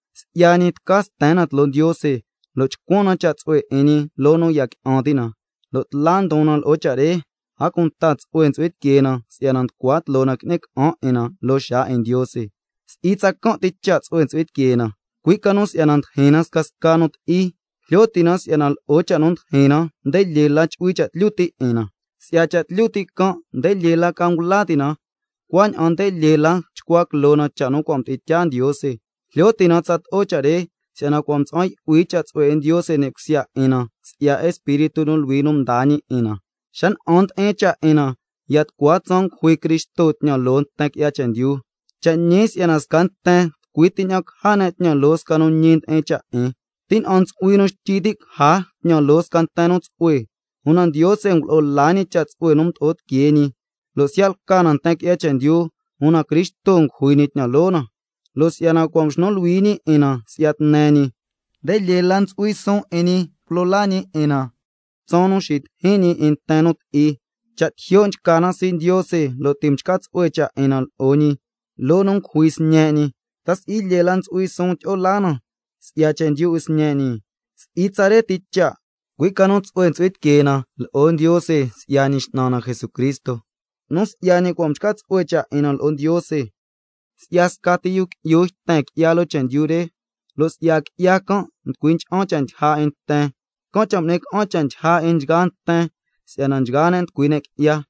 Si'ya ñi tca sten na tloo Ndiose lo' chcuan na cha' tsu'hue 'in ñi loo nu ya qui'an ti' na, lo' tla ndon na loo cha' re, a cunta tsu'hue ntsu'hui tiquee na si'yana nducua tloo na qui'ni ca'an 'in na loo xaa 'in Ndiose. Si'i tsacan' ti cha' tsu'hue ntsu'hui tiquee na, cui' ca nu si'yana ndijin na scasca nu ti'i, jlyo ti' na si'yana lo'o cha' nu ndijin na nde lyee la chu'hui cha' tlyu ti' 'in na, si'ya cha' tlyu ti' can' nde lyee la ca ngula ti' na, cuaña'an nde lyee la chcua quiloo na cha' nu cua' mdi'in tyaa Ndiose. Jlyo ti' na tsato'o cha' re, si'yana mtsa'an yu'hui cha' tsu'hue 'in Ndiose ni' cusya 'in na si'ya Espíritu nu Luhui nu mdaa ñi 'in na. Xa na'an ndi'in cha' 'in na, ya tucua tsaan ngujui Cristo tñan loo nten qui'ya chendyu. Cha' ñi si'yana sca nten tucui ti ña'an caja ne' tñan loo sca nu ñi ndi'in cha' 'in, tina'an ntsu'hui nu xtyi ti' caja tñan loo sca nten nu tsu'hue. Una Ndiose ngulo'o la ñi cha' tsu'hue nu mdo'o tiquee ñi, lo' siya' lca na nten qui'ya chendyu, Cristo ngujui ñi tñan loo na. Lo' si'yana cua' mxnu luhui ñi 'in na si'ya tne ñi, nde lyee la ntsu'hui suun tyi'o laa na si'ya ycui' ca ñi, tsaan nu xitijin ñi 'in nten nu ti'i. Cha' ncua ta'a cusuun na 'in Ndiose lo' ti' mchca tsu'hue cha' 'in na lo'o ñi loo nu ngujui Sñe' ñi, ¿ta si'i lyee la ntsu'hui suun tyi'o laa na si'ya chendyu 'in Sñe' ñi? Si'i tsare ti cha', cui' ca nu tsu'hue ntsu'hui tiquee na lo'o Ndiose si'ya Ñi X'nan na Jesucristo, nu si'ya ñi cua' mchca tsu'hue cha' 'in na lo'o Ndiose. Si'ya scati yu qui'yu yten qui'ya loo chendyu re, lo' si'ya qui'ya can' nducui ncha'an cha' ndyija 'in nten, can' cha' ngui'ni ca'an cha' ndyija 'in nchgaa nten si'yana nchgaa ne' nducui ne' qui'ya.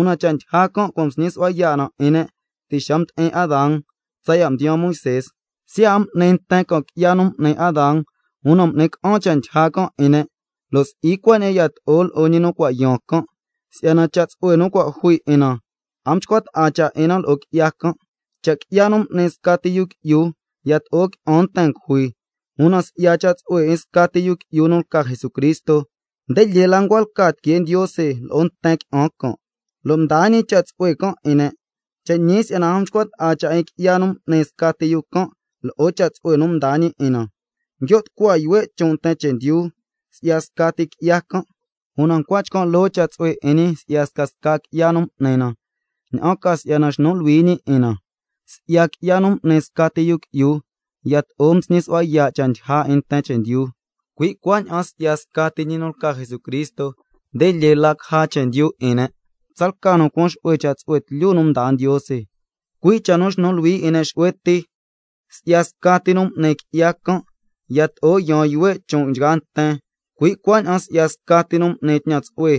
Una cha' ndyija can' cua' nsñi su'hua yaa' 'in ne' ti' xa mdi'in Adán tsaya' mdiyaan Moisé, siya' a m'ni nten can' qui'ya nu m'ni Adán, una m'ni ca'an cha' ndyija can' 'in ne', lo' si'i cuaña'an yato'o lo'o ñi nu cua' yaan can'. Si'yana cha' tsu'hue nu cua' jui 'in na a nchcua ta'a cha' 'in na lo'o qui'ya can': Cha' qui'ya nu m'ni scati yu qui'yu yato'o qui'an nten ngujui, una si'ya cha' tsu'hue 'in scati yu qui'yu nu lca Jesucristo, nde lyee la ncua lca tiquee Ndiose lo'o nten qui'an can' lo' mdaa ñi cha' tsu'hue can' 'in ne'. Cha' ñi si'yana a nchcua ta'a cha' 'in qui'ya nu m'ni scati yu can' lo'o cha' tsu'hue nu mdaa ñi 'in na: Nguio' tucua yuhue' chon' nten chendyu si'ya scati qui'ya can', una ncua chcan' loo cha' tsu'hue 'in ñi si'ya scasca qui'ya nu m'ni na, ña'an ca si'yana xnu luhui ñi 'in na. Si'ya qui'ya nu m'ni scati yu can' yato'o msñi su'hua yaa' cha' ndyija 'in nten chendyu, cui' cuaña'an si'ya scati ñi nu lca Jesucristo, nde lyee la caja chendyu 'in ne', tsalca nu cuan xu'hue cha' tsu'hue tlyu nu mdaa Ndiose, cui' cha' nu xnu luhui 'in ne' xu'hue ti. Si'ya scati nu m'ni qui'ya can' yato'o yaan yuhue' chon' nchgaa nten, cui' cuaña'an si'ya scati nu m'ni tñan tsu'hue,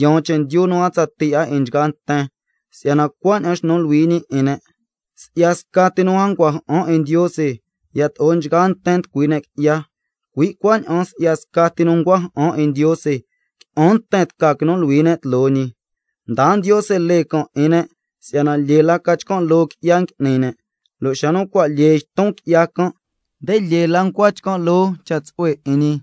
yaan chendyu nu a tsatii 'a 'in nchgaa nten si'yana cua' mxnu luhui ñi 'in ne'. Si'ya scati nu a ncua ja'an 'in Ndiose, yato'o nchgaa nten nducui ne' qui'ya, cui' cuaña'an si'ya scati nu ncua ja'an 'in Ndiose, qui'an nten tca quinu luhui ne' tloo ñi. Mdaa Ndiose lee can' 'in ne' si'yana lyee la ca chcan' loo qui'ya ngui'ni ne', lo' xa nu cua' lyee yton qui'ya can', una nde lyee la ncua chcan' loo cha' tsu'hue 'in ñi,